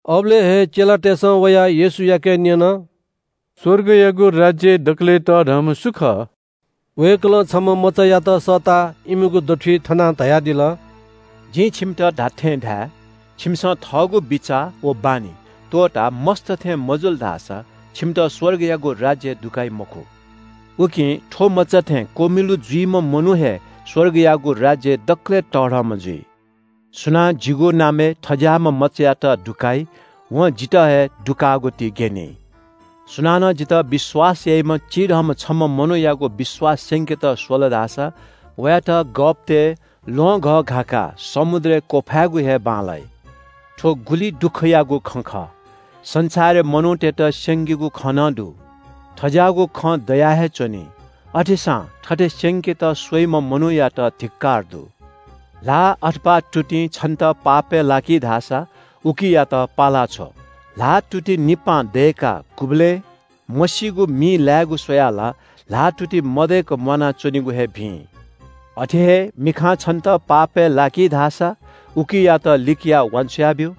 अबलय् हे चेलातय्‌सं वयाः येशूयाके न्‍यन – “स्‍वर्गयागु राज्‍यय् दकलय् तःधंम्‍ह सु खः?” वय्‌कलं छम्‍ह मचायात सःताः इमिगु दथुइ थनाः धयादिल – “जिं छिमित धात्‍थें धाये – छिमिसं थःगु बिचाः व बानी त्‍वःताः मस्‍त थें मजुल धाःसा छिमित स्‍वर्गयागु राज्‍यय् दुकाइ मखु। उकिं थ्‍व मचा थें क्‍वमिलु जुइम्‍ह मनू हे स्‍वर्गयागु राज्‍यय् दकलय् तःधंम्‍ह जुइ। “सुनां जिगु नामय् थज्‍याःम्‍ह मचायात दुकाइ, वं जितः हे दुकाःगु ति ग्‍यनी।” “सुनानं जितः विश्‍वास याइम्‍ह चिधंम्‍ह छम्‍ह मनूयात पापय् लाकेत स्‍वल धाःसा वयात गःपतय् ल्‍वहंघः घाकाः समुद्रय् क्‍वफायेगु हे बांलाइ। “थ्‍व गुलि दुःखयागु खँ खः – संसारय् मनूतय्‌त स्‍यंकीगु खँ नं दु। थज्‍याःगु खँ दया हे च्‍वनी। अथेसां थथे स्‍यंकेत स्‍वइम्‍ह मनूयात धिक्‍कार दु।” “ल्‍हाः अथवा तुतिं छन्‍त पापय् लाकी धाःसा उकियात पाला छ्व। ल्‍हाःतुति निपां दय्‌काः गुबलें मसीगु मिइ लायेगु स्‍वयाः ला ल्‍हाःतुति मदय्‌क म्‍वानाच्‍वनेगु हे भिं। अथे हे मिखां छन्‍त पापय् लाकी धाःसा उकियात लिकयाः वान्‍छ्वया ब्‍यु।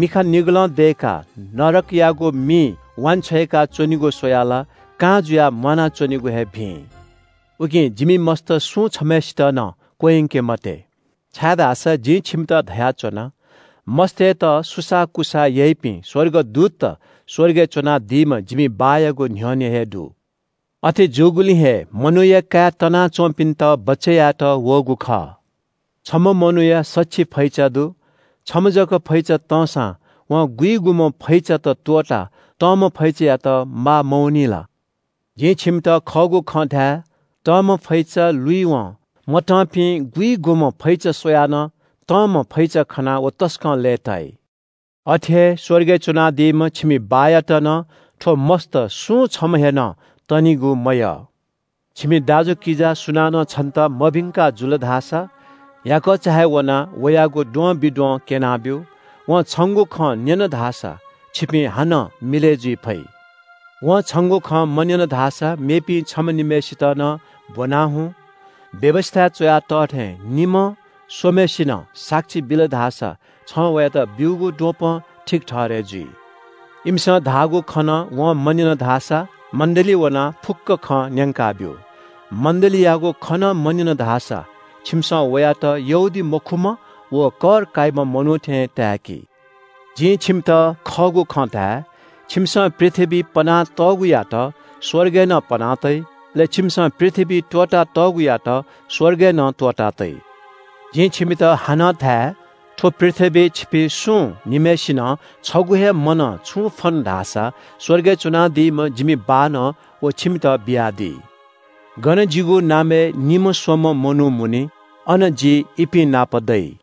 मिखा निगलं दय्‌काः नरकयागु मिइ वांछ्वय्‌का च्‍वनेगु स्‍वयाः ला कां जुयाः म्‍वानाच्‍वनेगु हे भिं।” “उकिं जिमि मस्‍त सुं छम्‍हय्‌सित नं क्‍वह्यंके मते, छाय्‌धाःसा जिं छिमित धयाच्‍वना – मस्‍तय्‌त सुसाःकुसाः याइपिं स्‍वर्गदूतत स्‍वर्गय् च्‍वनादीम्‍ह जिमि बाःयागु न्‍ह्यःने हे दु। अथे जूगुलिं हे मनूया काय् तनाच्‍वंपिन्‍त बचय् यायेत वःगु खः। “छम्‍ह मनूया सछि फैचा दु। छम्‍ह जक फैचा तंसां वं गुइगुम्‍ह फैचात त्‍वःताः तंम्‍ह फैचायात माः मवनी ला? जिं छिमित खःगु खँ धाये – तंम्‍ह फैचा लुइवं मतंपिं गुइगुम्‍ह फैचा स्‍वयाः नं तंम्‍ह फैचा खनाः व तसकं लय्‌ताइ। अथे हे स्‍वर्गय् च्‍वनादीम्‍ह छिमि बाःयात नं थ्‍व मस्‍त सुं छम्‍ह हे नं तनिगु मयः। “छिमि दाजुकिजा सुनानं छन्‍त मभिंका जुल धाःसा याकःचा हे वनाः वयागु द्वंबिद्वं क्‍यनाब्‍यु। वं छंगु खँ न्‍यन धाःसा छिपिं हानं मिलय् जुइ फइ। वं छंगु खँ मन्‍यन धाःसा मेपिं छम्‍ह निम्‍हय्‌सित नं ब्‍वनाः हुँ। व्‍यवस्‍थाय् च्‍वया तः थें निम्‍ह स्‍वम्‍हय्‌सिनं साक्षी बिल धाःसा छं वयात ब्‍यूगु द्वपं ठीक ठहरय् जुइ। इमिसं धाःगु खँ नं वं मन्‍यन धाःसा मण्‍डलीइ वनाः फुक्‍क खँ न्‍यंकाब्‍यु। मण्‍डलीयागु खँ नं मन्‍यन धाःसा छिमिसं वयात यहूदीमखुम्‍ह व कर काइम्‍ह मनू थें ताय्‌कि। “जिं छिमित खःगु खँ धाये – छिमिसं पृथ्‍वीइ पना तःगुयात स्‍वर्गय् नं पना तइ। अले छिमिसं पृथ्‍वीइ त्‍वःता तःगुयात स्‍वर्गय् नं त्‍वःता तइ। “जिं छिमित हानं धाये – थ्‍व पृथ्‍वीइ छिपिं सुं निम्‍हय्‌सिनं छगू हे मनं छुं फ्‍वन धाःसा स्‍वर्गय् च्‍वनादीम्‍ह जिमि बाःनं व छिमित बियादी। गन जिगु नामय् निम्‍ह स्‍वम्‍ह मनू मुनी, अन जि इपिं नाप दइ।”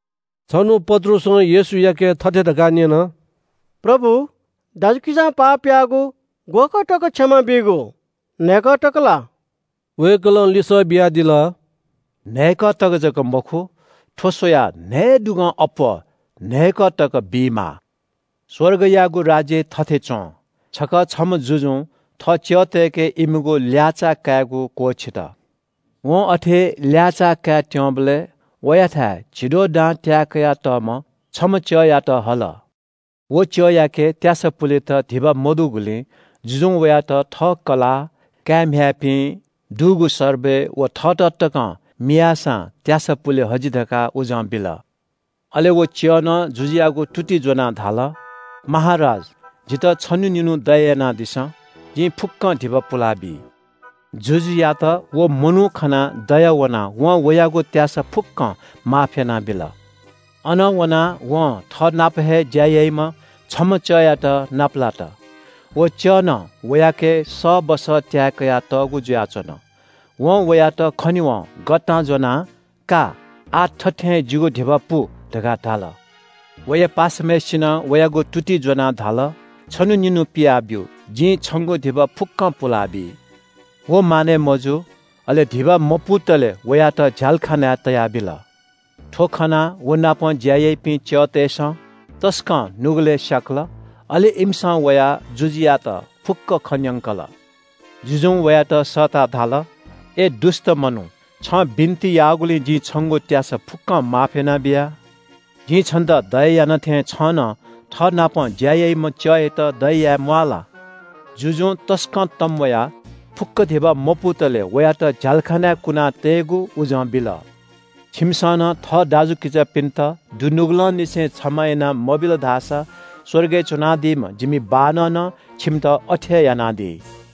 छन्‍हु पत्रुसं येशूयाके थथे धकाः न्‍यन – “प्रभु, दाजुकिजां पाप याःगु ग्‍वःकः तक क्षमा बीगु? न्‍हय्‌कः तक ला?” वय्‌कलं लिसः बियादिल – “न्‍हय्‌कः तक जक मखु। थ्‍व स्‍वयाः न्‍हयेदुगं अप्‍वः न्‍हय्‌कः तक बीमाः। “स्‍वर्गयागु राज्‍य थथे च्‍वं – छकः छम्‍ह जुजुं थः च्‍यःतय्‌के इमिगु ल्‍याःचाः कायेगु क्‍वःछित। वं अथे ल्‍याःचाः काय् त्‍यंबलय् वयाथाय् झिद्वः दां त्‍याये कयातःम्‍ह छम्‍ह च्‍यःयात हल। व च्‍यःयाके त्‍यासा पुलेत धिबा मदुगुलिं जुजुं वयात थः कलाः, काय्‌म्‍ह्याय्‌पिं, दुगु सर्बय व थःत तकं मियाःसां त्‍यासा पुले हजि धकाः उजं बिल। “अले व च्‍यःनं जुजुयागु तुति ज्‍वनाः धाल – ‘महाराज, जितः छन्‍हु निन्‍हु दया यानादिसँ। जिं फुक्‍कं धिबा पुलाबी।’ जुजुयात व मनू खनाः दया वनाः वं वयागु त्‍यासा फुक्‍कं माफ यानाबिल।” “अनं वनाः वं थःनाप हे ज्‍या याइम्‍ह छम्‍ह च्‍यःयात नापलात। व च्‍यःनं वयाके सःबस त्‍याये कयातःगु जुयाच्‍वन। वं वयात खनेवं गःतां ज्‍वनाः – ‘का, आः थथें हे जिगु धिबा पु’ धकाः धाल। “वया पासाम्‍हय्‌सिनं वयागु तुति ज्‍वनाः धाल – ‘छन्‍हु निन्‍हु पिया ब्‍यु। जिं छंगु धिबा फुक्‍कं पुलाबी।’ व मानय् मजू। अले धिबा मपुतले वयात झ्‍यालखानाय् तयाबिल। “थ्‍व खनाः वनापं ज्‍या याइपिं च्‍यःतय्‌सं तसकं नुगलय् स्‍याकल। अले इमिसं वयाः जुजुयात फुक्‍क खँ न्‍यंकल। जुजुं वयात सःताः धाल – ‘अय् दुष्‍ट मनू, छं बिन्‍ति याःगुलिं जिं छंगु त्‍यासा फुक्‍कं माफ यानाबिया। जिं छन्‍त दया याना थें छं नं थःनापं ज्‍या याइम्‍ह च्‍यःयात दया याये म्‍वाः ला?’ जुजुं तसकं तंम्‍वयाः फुक्‍क धिबा मपुतले वयात झ्‍यालखानाय् कुना तयेगु उजं बिल।” “छिमिसं नं थः दाजुकिजापिन्‍त दुनुगलंनिसें क्षमा याना मबिल धाःसा स्‍वर्गय् च्‍वनादीम्‍ह जिमि बाःनं नं छिमित अथे हे यानादी।”